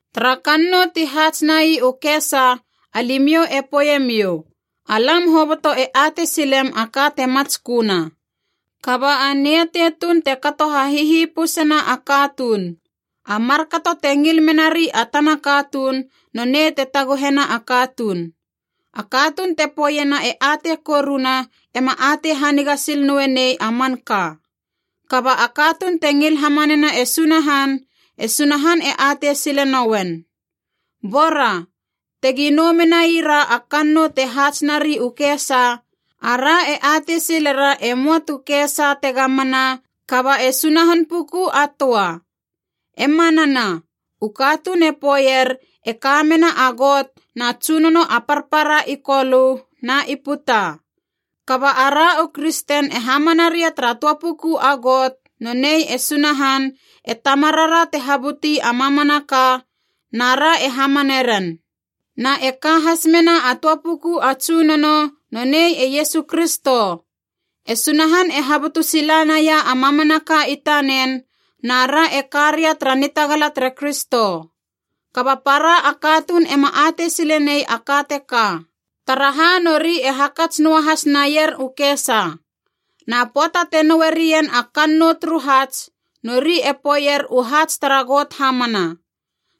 Tara kannou ti haats nai u kesa alimiou e poeiemiou, “Alam hoboto e atei silem a ka te matsköna.” Kaba a niatei tuun te kato ha hihipusena a katuun. A markato te ngil menari a tana katuun nonei te taguhena a katuun. A katuun te poeiena e atei koruna ema atei haniga sil noe nei a manka. Kaba a katuun te ngil hamanena e Sunahan, e Sunahan e atei sile nouen. Bora, tegi nou menaira a kannou te haats nari u kesa, ara e atei silera e möa tu kesa tega mana kaba e Sunahan puku a töa. E manana, u katuun e poeier e ka mena a got na tsunono a parpara i Kolö na i puta. Kaba ara u kristen e hamana ria tara töa puku a Got, nonei e Sunahan, e Tamarara te habuti a mamanaka, na ra e hamane ren. Na e ka has mena a töa puku a Tsunono, nonei e Iesu Kristo. E Sunahan e habutu sila naia a mamanaka i tanen, na ra e ka ria tara nitagala tere Kristo. Kaba para a katuun ema atei silenei a ka teka. Taraha nori e hakats noa has naier u kesa. Na pöata te noue rien a kannou turu haats, nori e poeier u haats tara got hamana.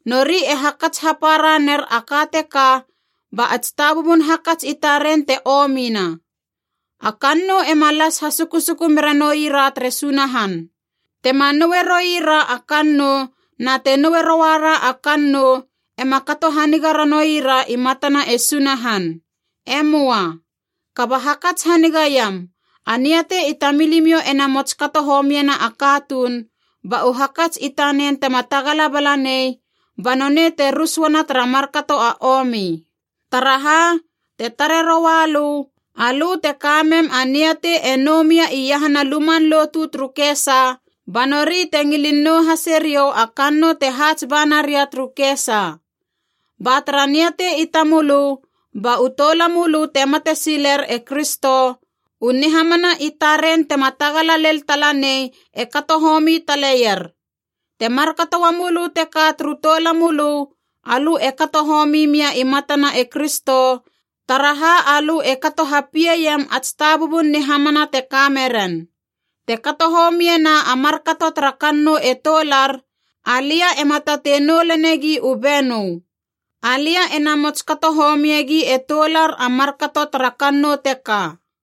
Nori e hakats hapara ner a ka teka ba a tsitabubun hakats i taren te omina. A kannou ema las hasusuku mera noi ra tere Sunahan. Tema noe roira a kannou na te noe rouara a kannou ema kato haniga ranoui ra i matana e Sunahan. E möa. Kaba hakats hanigaiam a niatei i tamilimiou ena mots kato homiena a katuun, ba u hakats i tanen tema tagala balanei banonei te rus uana tara markato a omi. Taraha, te tare roua lö, alö te kamem a niatei e nou mia iahana luman lotu turu kesa, ba nori te ngilin nou hase riou a kannou te haats ba naria turu kesa. Ba tara niatei i tamölö ba u toulamölö te mate silir e Kristo, u nihamana i taren tema tagala lel talanei e kato homi taleier. Te markato uamölö teka turu toulamölö, alö e kato homi mia i matana e Kristo, taraha alö e kato hapieiem ats tabubun nihamana te kame ren. Te kato homie na a markato tara kannou e toular, alia ema tatei nou lenegi u benö. Alia ena mots kato homiegi e toular a markato tara kannou teka.